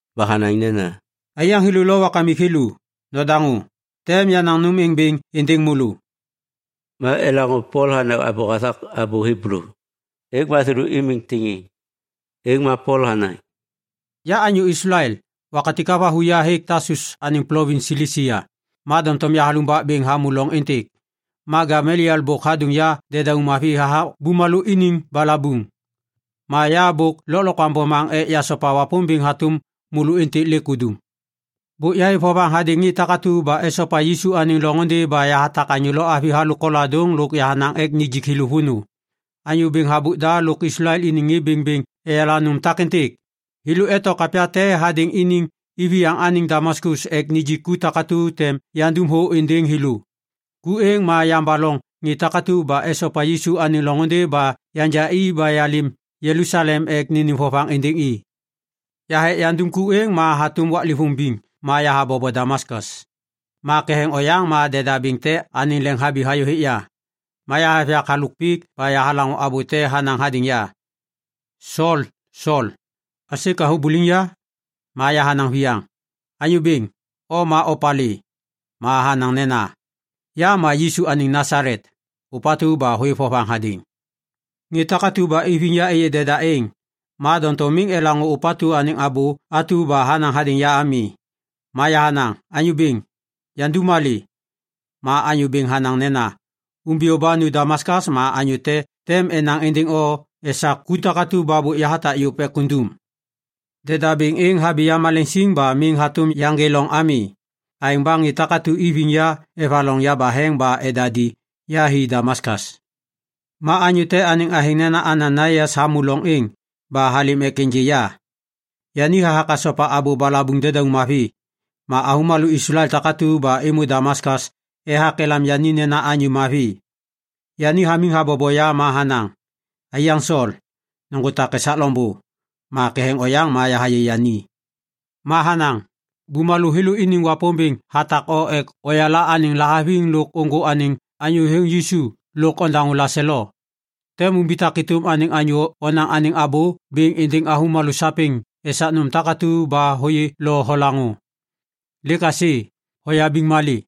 Ba hanaŋ nena, “Aiyaŋ thêlô lo wakamik thêlô, nodaŋô. Tem yanaŋ nôm êŋ bêŋ êndêŋ môlô.” Ma elaŋô Pol hanaŋ abô hathak abô Hiblu, êŋ ma thêlô imiŋ tiŋiŋ. Êŋ ma Pol hanaŋ, “Ya anyô Islael. Wakatik havathu ya hêk Tasus anêŋ plovins Silisia, ma doŋtom yahalumbak bêŋ hamô loŋ êntêk. Ma Gameliel bôk hadôŋ ya dedauŋ mavi hathak bumalô iniŋ balabuŋ. Ma ya bôk lôklokwaŋ bomaŋ ek yasopa Wapômbêŋ hatôm môlô êntêk lêk udum. Bôk yahêv vovaŋ hadêŋ ŋê takatu ba esopa Yisu anêŋ loŋôndê ba yahatak anyô lo avi halôk koladôŋ lôk yahanaŋ ek nijik thêlô vônô. Anyô bêŋ habôk da lôk Islael iniŋ ŋê bêŋbêŋ eyala nôm takêntêk. Thêlô eto kapya te hadêŋ iniŋ iviyaŋ anêŋ Damaskas ek nijik ku takatu tem yandum thô êndêŋ thêlô. Ku êŋ ma yambaloŋ ŋê takatu ba esopa Yisu anêŋ loŋôndê ba yanja i ba yalêm Jelusalem ek nênêm vovaŋ êndêŋ i. “Yaha ek yandum ku êŋ ba hatôm waklêvôŋ biŋ ma yahabobo Damaskas. Ma ketheŋ oyaŋ ma deda bêŋ te anêŋ leŋ habi hayô hêk ya. Ma yahêv yak halôk pik ma yahalaŋô abô te hanaŋ hadêŋ ya, ‘Sol, Sol, aisê ka hubuliŋ ya?’ “Ma yahanaŋ viyaŋ, ‘Anyô Bêŋ, o ma opalê?’ “Ma hanaŋ nena, ‘Ya Yisu anêŋ Nasalet, ôpatu ba hôêv vovaŋ hadêŋ.’ Ŋê takatu ba iviŋ ya êyê deda êŋ, ma doŋtom miŋ elaŋô ôpatu anêŋ abô atu ba hanaŋ hadêŋ ya ami. “Ma yahanaŋ, ‘Anyô Bêŋ, yandum malê?’ “Ma Anyô Bêŋ hanaŋ nena, ‘Umbiyô ba nu Damaskas ma anyô te tem enaŋ êndêŋ o esak ku takatu ba bôk yahatak yôv ek undum.’ Deda bêŋ êŋ habi yamaleŋ siŋ ba miŋ hatôm yaŋgê loŋ ami. Aêŋ ba ŋê takatu iviŋ ya evaloŋ yabaheŋ ba edadi ya hi Damaskas. “Ma anyô te anêŋ athêŋ nena Ananaias hamô loŋ êŋ ba halêm ek ênjê ya. Yani hathak hasopa abô balabuŋ dedauŋ mavi, ma avômalô Islael takatu ba êmô Damaskas ethak elam yani nena anyô mavi. Yani hamiŋ habobo ya ma hanaŋ, ‘Aiyaŋ Sol, nôŋgô tak esak loŋbô!’ Ma ketheŋ oyaŋ ma yahayê yani. “Ma hanaŋ, ‘Bumalô thêlô iniŋ Wapômbêŋ hatak o ek oyala anêŋ lahaviŋ lôk nôŋgô anêŋ Anyô Thêthôŋ Yisu lôk ondaŋô laselo. Tem umbitak êtôm anêŋ anyô onaŋ anêŋ abô bêŋ êndêŋ avômalô sapêŋ esak nôm takatu ba hôyê lo holaŋô. Lêk aisê, hoyabiŋ malê?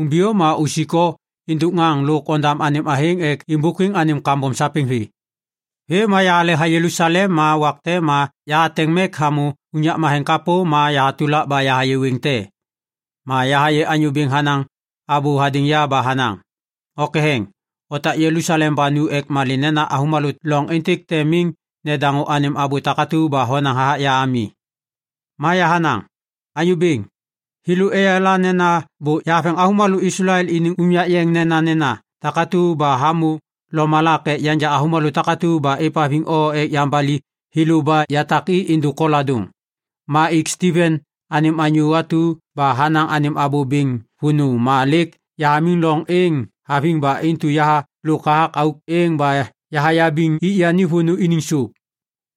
Umbiyô ma usik o êndôk ŋaŋ lôk ondam anêŋ athêŋ ek êmbôkwiŋ anêm kambom sapêŋ vê.’ “Vêm ma yahaleha Jelusalem ma wak te ma yahateŋ mek hamô unyak matheŋ kapô ma yahatulak ba yahayê wêŋ te. Ma yahayê Anyô Bêŋ hanaŋ abô hadêŋ ya ba hanaŋ, ‘O ketheŋ, otak Jelusalem ba nu. Ek malê nena avômalô loŋ êntêk tem miŋ nedaŋô anêm abô takatu ba honaŋ hathak ya ami.’ “Ma yahanaŋ, ‘Anyô Bêŋ, thêlô eyala nena bôk yahaveŋ avômalô Islael iniŋ unyak yeŋ nenanena takatu ba hamô lomalak ek yanja avômalô takatu ba êvhaviŋ o ek yambali thêlô ba yatak i êndôk koladôŋ. Ma ik Stiven anêm anyô atu ba hanaŋ anêm abô bêŋ vônô ma lêk yahamiŋ loŋ êŋ haviŋ ba intu yahalôk hathak auk êŋ ba yahayabiŋ ŋê ik yani vônô iniŋ sôp.’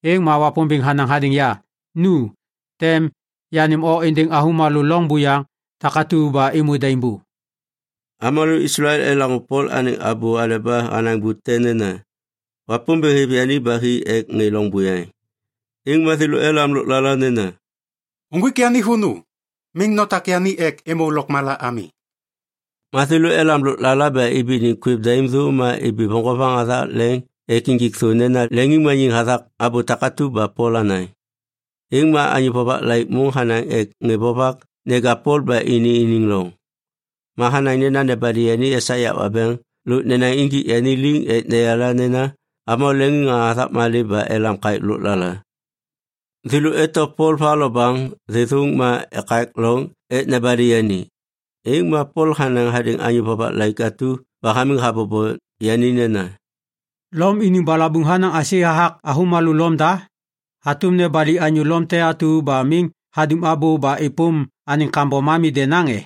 “Êŋ ma Wapômbêŋ hanaŋ hadêŋ ya, ‘Nu, tem yanêm o êndêŋ avômalô loŋ buyaŋ takatu ba êmô daimbô.’” Avômalô Islael elaŋô Pol anêŋ abô aleba hanaŋ bute nena, “Wapômbêŋ hêv yani ba hi ek ŋê loŋ buyaŋ”, êŋ ma thêlô elam lôklala nena, “Uŋgwik yani vônô! Miŋ notak yani ek êmô lôkmala ami.” Ma thêlô elam lôklala ba ibi iniŋ kwêv daim thô ma ibi voŋgovaŋ hathak leŋ ek injik thô nena leŋiŋmaniŋ hathak abô takatu ba Pol hanaŋ. Êŋ ma anyô vovak laik môŋ hanaŋ ek ŋê vovak neja Pol ba ini iniŋ loŋ. Ma hanaŋ nena nebali yani esak yak wabeŋ lôk nenaŋ injik yani liŋ ek neyala nena avômalô leŋiŋŋaŋa hathak malê ba elam kaêk lôklala. Thêlô eto Pol va lo baŋ thêthôŋ ma ekak loŋ ek nebali yani, êŋ ma Pol hanaŋ hadêŋ anyô vovak laik atu ba hamiŋ habobo yani nena, “Lom iniŋ balabuŋ hanaŋ aisê hathak avômalô Lom da? Hatôm nobali anyô Lom te atu ba miŋ hadum abô ba êpôm anêŋ kambom ami denaŋ e?”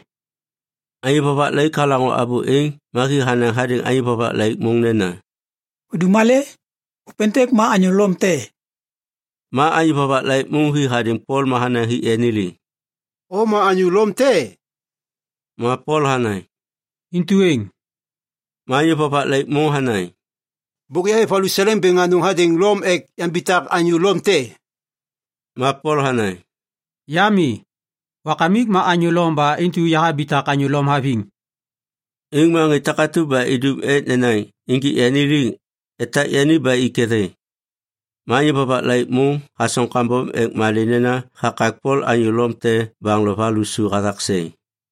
Anyô vovak laik halaŋô abô êŋ ma hi hanaŋ hadêŋ anyô vovak laik môŋ nena, “Hudum malê? Ôpêntêk ma anyô Lom te.” Ma anyô vovak laik môŋ hi hadêŋ Pol ma hanaŋ hik yani liŋ, “O ma anyô Lom te e?” Ma Pol hanaŋ, “Intu êŋ.” Ma anyô vovak laik môŋ hanaŋ, “Bôk yahêv valuseleŋ bêŋ anôŋ hadêŋ Lom ek yambitak anyô Lom te.” Ma Pol hanaŋ, “Ya mi, wakamik ma anyô Lom ba intu yahabitak anyô Lom haviŋ.” Êŋ ma ŋê takatu ba idum ek nenaŋ injik yani liŋ, etak yani ba i ketheŋ. Ma anyô vovak laik môŋ hasoŋ kambom ek malê nena hakak Pol anyô Lom te baŋ lo va lusu hathak seŋ.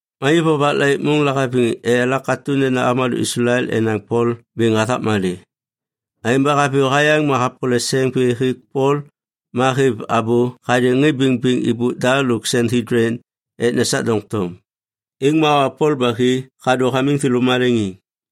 Ma anyô vovak laik môŋ lahaviŋ eyala katô nena avômalô Islael enaŋ Pol bêŋ hathak malê. Aêŋ ba haviyô hayaŋ ma hapole seŋ vê hêk Pol ma hêv abô hadêŋ ŋê bêŋbêŋ êbôk da lôk Sanhedlin ek nesak doŋtom. Êŋ ma hawa Pol ba hi hadô hamiŋ thêlô maleŋiŋ.